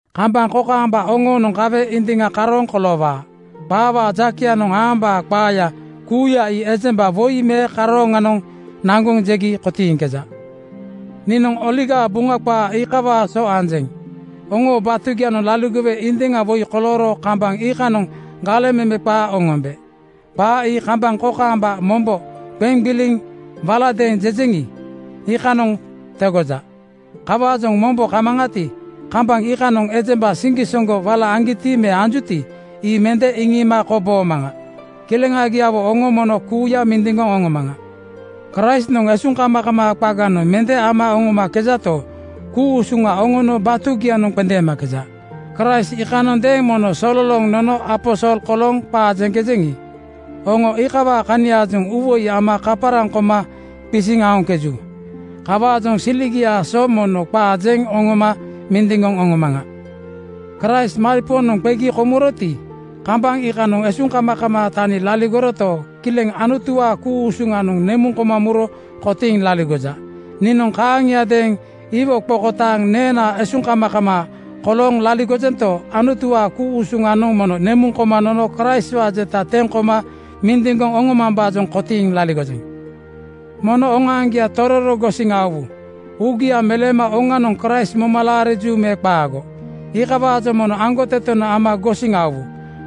Kambaŋ kokaamba oŋoonoŋ kawe indiŋa karooŋ koloowaa. “Qaawaa jakeyanoŋ aambaa qaaya kuuya ii ejemba woi me karooŋanoŋ naŋgoŋ jegi kotiiŋkeja.” Niinoŋ Buŋa qaa iikawaa so anjeŋ. Oŋoo batugianoŋ laligowe indiŋa woi kolooro kambaŋ iikanoŋ galeŋ meme qaa oŋombe. Qaa ii kambaŋ kokaamba mombo qeŋ gbiliŋ waladeeŋ jejeŋi, iikanoŋ tegoja. Kawaajoŋ mombo kamaŋati, kambaŋ iikanoŋ ejemba siŋgisoŋgo wala aŋgiti me anjuti, ii mende iŋiima koboomaŋa. Kileŋagiawo oŋo mono kuuya mindiŋgoŋ oŋomaŋa. Kraistnoŋ esuŋkamakamaa qaganoŋ mende ama oŋomakejato, ku-usuŋa oŋoo batugianoŋ qendeemakeja. Kraist iikanondeeŋ mono sololooŋ nono aposol kolooŋ qaa jeŋkejeŋi, oŋo iikawaa kaniaajoŋ uuwoi ama kaparaŋ koma qisiŋ aoŋkeju. Kawaajoŋ siligiaa so mono qaa jeŋ oŋoma mindiŋgoŋ oŋomaŋa. Kraist maripoonoŋ qegi komuroti, kambaŋ iikanoŋ esuŋkamakamaa tani laligoroto, kileŋ Anutuwaa ku-usuŋanoŋ nemuŋ koma muro kotiiŋ laligoja. Niinoŋ kaaŋiadeeŋ iwo qokotaaŋ neena esuŋkamakamaa kolooŋ laligojento, Anutuwaa ku-usuŋanoŋ mono nemuŋ koma nono Kraistwaa jeta teŋ koma mindiŋgoŋ oŋomambaajoŋ kotiiŋ laligojeŋ. Mono oŋoaŋgia tororo gosiŋ aowu. Uugia meleema oŋanoŋ Kraist moma laariju me qaago, iikawaajoŋ mono aŋgotetenoŋ ama gosiŋ aowu.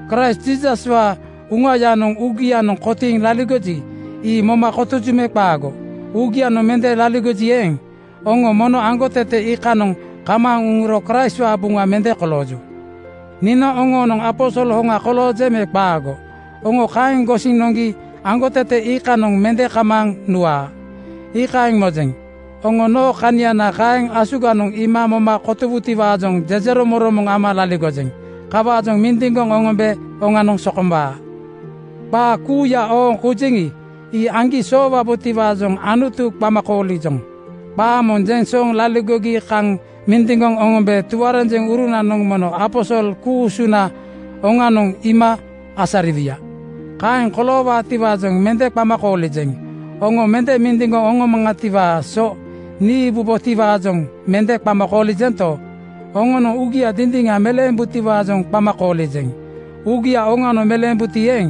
Kraist Jiisaswaa Uŋayanoŋ uugianoŋ kotiiŋ laligoji, ii moma kotoju me qaago? Uugianoŋ mende laligoji eeŋ, oŋo mono aŋgotete iikanoŋ kamaaŋ uŋuro Kraistwaa buŋa mende kolooju. Niinoŋ oŋoonoŋ aposol hoŋa koloojeŋ me qaago, oŋo kaeŋ gosiŋ noŋgi aŋgotete iikanoŋ mende kamaaŋ nuwaa, iikaeŋ mojeŋ. Oŋo noo kaniana kaeŋ asuganoŋ iima moma kotowutiwaajoŋ jejeromoŋromoŋ ama laligojeŋ. Kawaajoŋ mindiŋgoŋ oŋombe oŋanoŋ sokombaa. Qaa kuuya ooŋ koujeŋi, ii aŋgi soowabotiwaajoŋ Anutu qama koolijoŋ. Qaa moŋ jeŋ sooŋ laligogi kaŋ mindiŋgoŋ oŋombe tuarenjeŋurunanoŋ mono aposol ku-usuna oŋanoŋ iima asariwuya. Kaeŋ koloowaatiwaajoŋ mende qama koolijeŋ. Oŋo mende mindiŋgoŋ oŋomaŋatiwaa so niibubotiwaajoŋ mende qama koolijento, oŋonoŋ uugia dindiŋa meleembutiwaajoŋ qama koolijeŋ. Uugia oŋanoŋ meleembuti eeŋ,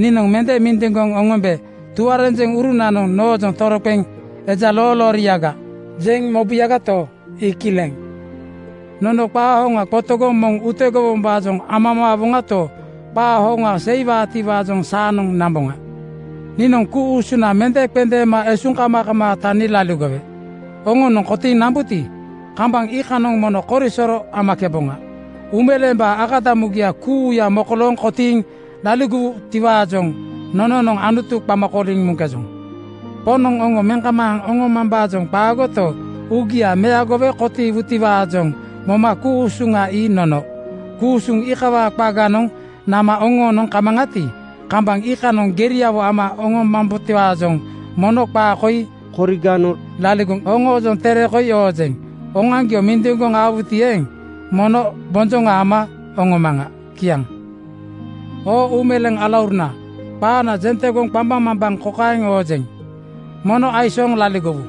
niinoŋ mende mindiŋgoŋ oŋombe tuarenjeŋurunanoŋ noojoŋ toroqeŋ “Eja loolooriaga!” jeŋ mobuyagato, ii kileŋ. Nono qaa hoŋa qotogoŋ moŋ utegowombaajoŋ amamaawoŋato, qaa hoŋanoŋ seiwaatiwaajoŋ saanoŋ namboŋa. Niinoŋ ku-usuna mende qendeema esuŋkamakamaa tani laligowe oŋonoŋ kotiiŋ nambuti, kambaŋ iikaaŋanoŋ mono korisoro amakeboŋa. Uumeleembaa akadamugia kuuya mokolooŋ kotiiŋ nambutiwaajoŋ nononoŋ Anutu qama kooliŋ muŋkejoŋ. Poŋnoŋ oŋo meŋ kamaaŋ oŋomambaajoŋ qaagoto, uugia meagowe kotiiwutiwaajoŋ moma ku-usuŋa ii nono. Ku-usuŋ iikawaa qaganoŋ nama oŋoonoŋ kamaŋati, kambaŋ iikanoŋ geriawo ama oŋomambotiwaajoŋ mono qaa koi koriganoŋ laligoŋ oŋoojoŋ tere koi oojeŋ. Oŋoaŋgio mindiŋgoŋ aowuti eeŋ, mono bonjoŋa ama oŋomaŋa. Kiaŋ. Oo uumeleeŋ alauruna, qaana jeŋ tegoŋ qambaŋmambaŋ kokaeŋ oŋonjeŋ: Mono aisooŋ laligowu.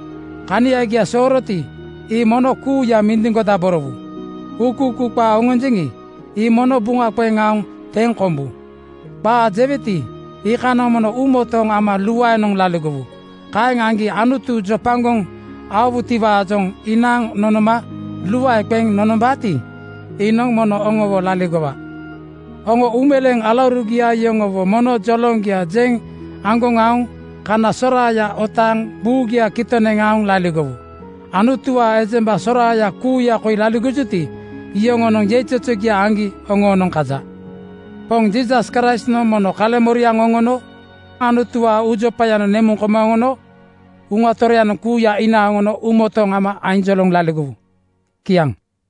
Kaniagia sooroti, ii mono kuuya mindiŋgodaborowu. Uukuukuu qaa oŋonjeŋi, ii mono buŋa qeŋ aoŋ teŋ kombu. Qaa jeweti, iikanoŋ mono uumotooŋ ama luaenoŋ laligowu. Kaeŋ aŋgi Anutu jopagoŋ aowutiwaajoŋ inaaŋ nonoma luae qeŋ nonombaati, iinoŋ mono oŋowo laligowa. Oŋo uumeleeŋ alaurugia yoŋowo mono joloŋgia jeŋ aŋgoŋ aoŋ kana soraaya otaaŋ buugia kitoŋ neŋ aoŋ laligowu. Anutuwaa ejemba soraaya kuuya koi laligojuti, iyoŋonoŋ yeizozogia aŋgi oŋoonoŋ kaja. Poŋ Jiisas Kraistnoŋ mono kaleŋmoriaŋa oŋono Anutuwaa uujopayanoŋ nemuŋ koma oŋono Uŋa Toroyanoŋ kuuya inaaŋ oŋono uumotooŋ ama ainjoloŋ laligowu. Kiaŋ.